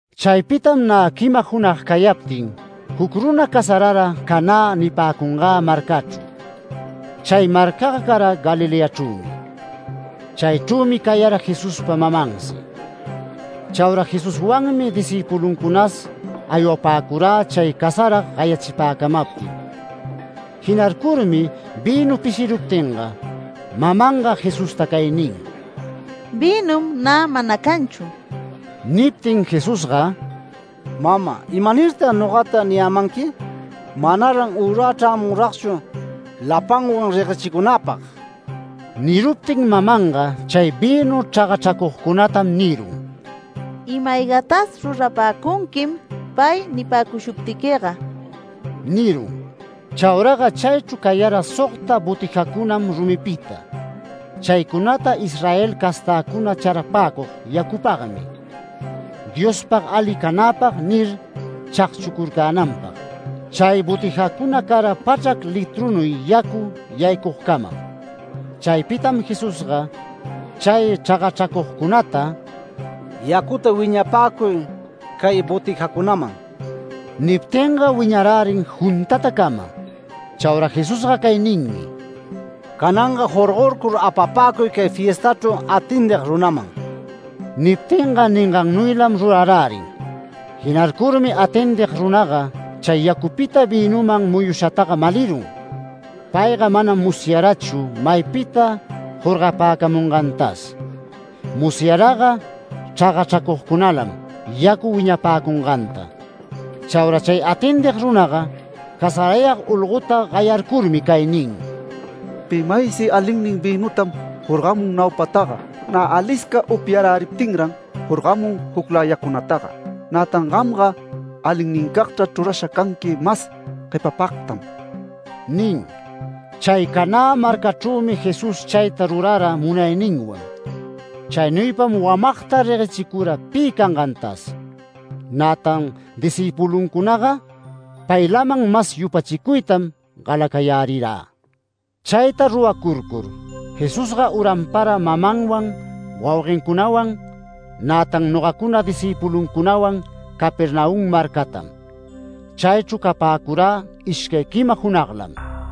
Chaypitam nä quima junag cayaptin, juc runa casarara Canä nipäcungä marcachru. Chay marcaga cara Galileachrümi. Chaychrümi cayara Jesuspa mamansi. Chaura Jesuswanmi discïpuluncunas aywapäcurä chay casarag gayachipäcamaptin. Jinarcurmi vïnu pishiruptinga, mamanga Jesusta cay nin: “Vïnum nä mana canchu”. Niptin Jesusga “Mama, ¿imanirtag nogata niyämanqui? Manaran ürä chrämunragchu lapanwan reguechicunäpag”. Niruptin mamanga chay vïnu chragachracugcunatam nirun: “Ima-aygatas rurapäcunquim pay nipäcushuptiquiga” nirun. Chauraga chaychru cayara sogta botijacunam rumipita. Chaycunata Israel castäcuna charapäcug yacupagmi “Diospag ali canäpag” nir, chagchucurcänanpag. Chay botijacuna cara pachrac litrunuy yacu yaycugcamam. Chaypitam Jesusga chay chragachracugcunata “Yacuta wiñapäcuy cay botijacunaman”. Niptinga wiñarärin juntatacama. Chaura Jesusga cay ninmi: “Cananga jorgorcur, apapäcuy cay fiestachru atendig runaman”. Niptinga ningannuylam rurarärin. Jinarcurmi atendig runaga chay yacupita vïnuman muyushataga malirun. Payga manam musyarachu maypita jorgapäcamungantas. Musyaraga chragachracugcunalam yacu wiñapäcunganta. Chaura chay atendig runaga, casarayag olgota gayarcurmi cay nin: “Pi maysi alinnin vïnutam jorgamun naupataga. Nä alisca upyaräriptinran jorgamun jucläyacunataga. Nätan gamga alinnincagta chrurasha canqui mas guepapagtan” nin. Chay Canä marcachrümi Jesús chayta rurara munayninwan. Chaynuypam wamagta reguechicura pi cangantas. Nätan discïpuluncunaga paylaman mas yupachicuytam galacayarärirä. Chayta ruracurcur, Jesusga uranpara mamanwan, wauguencunawan, nätan nogacuna discïpuluncunawan Capernaum marcatam. Chaychru capäcurä ishcay quima junaglam.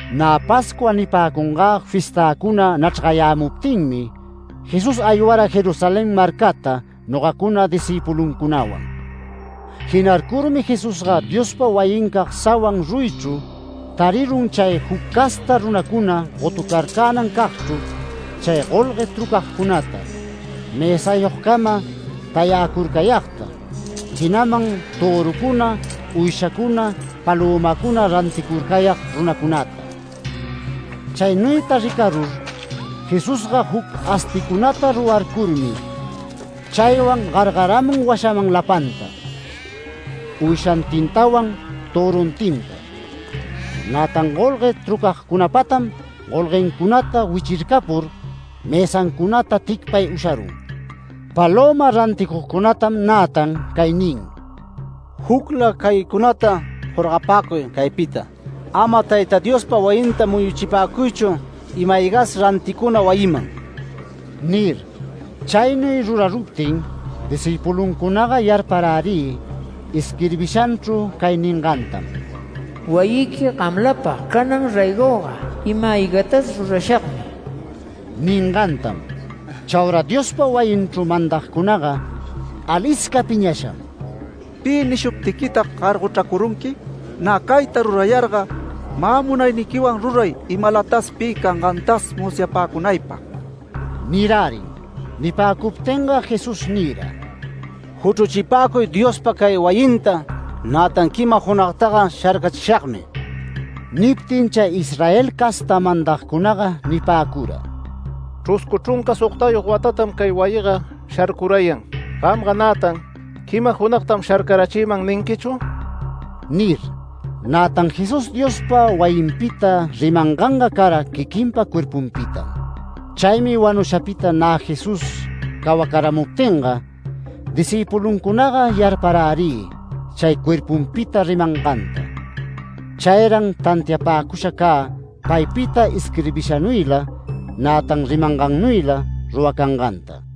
Nä Pascua nipäcungä fiestäcuna nachrgayämuptinmi Jesús aywara Jerusalén marcata nogacuna discïpuluncunawan. Jinarcurmi Jesusga Diospa wayincag sawan ruyichru tarirun chay juc casta runacuna gotucarcänan cagchru chay golgue trucagcunata, mësayogcama tayäcurcayagta, jinaman törucuna, uyshacuna, palömacuna ranticurcayag runacunata. Chaynuyta ricarur Jesusga, juc asticunata rurarcurmi chaywan gargaramun washaman lapanta, uyshantintawan töruntinta. Nätan golgue trucagcunapatam golguencunata wichircapur mësancunata ticpay usharun. Palöma ranticugcunatam nätan cay nin: “Jucla caycunata jorgapäcuy caypita. Ama Tayta Diospa wayinta muyuchipäcuychu ima-aygas ranticuna wayiman” nir. Chaynuy ruraruptin discïpuluncunaga yarparärï isquirbishanchru cay ningantam: “Wayiqui gamlapag canan raygoga ima-aygatas rurashagmi” ningantam. Chaura Diospa wayinchru mandagcunaga alisca piñasham “¿Pi nishuptiquitag gargochracurunqui? Nä cayta rurayarga, mä munayniquiwan ruray imalatas pi cangantas musyapäcunaypag” nirärin. Nipäcuptinga Jesús nira: “Juchruchipäcuy Diospa cay wayinta, nätan quima junagtaga sharcachishagmi”. Niptin chay Israel casta mandacunaga nipäcura: “Chruscu chrunca sogtayog watatam cay wayiga sharcurayan. Gamga nätan ¿quima junagtam sharcarachiman ninquichu?” nir. Nätan Jesús Diospa wayinpita rimanganga cara quiquinpa cuerpunpitam. Chaymi wanushapita nä Jesús cawacaramuptinga discïpuluncunaga yarparärï chay cuerpunpita rimanganta. Chayran tantiapäcusha cä paypita isquirbishanuyla, nätan rimangannuyla ruracanganta.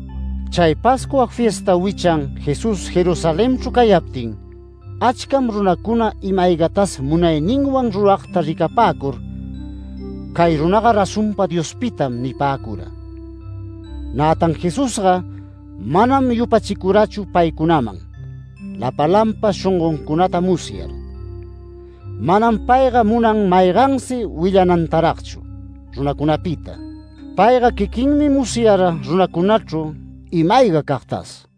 Chay Pascua fiesta wichan Jesús Jerusalenchru cayaptin, achcam runacuna ima-aygatas munayninwan ruragta ricapäcur “Cay runaga razonpa Diospitam” nipäcura. Nätan Jesusga manam yupachicurachu paycunaman, lapalanpa shongoncunata musyar. Manam payga munan maygansi willanantaragchu runacunapita. Payga quiquinmi musyara runacunachru ima-aygacagtas.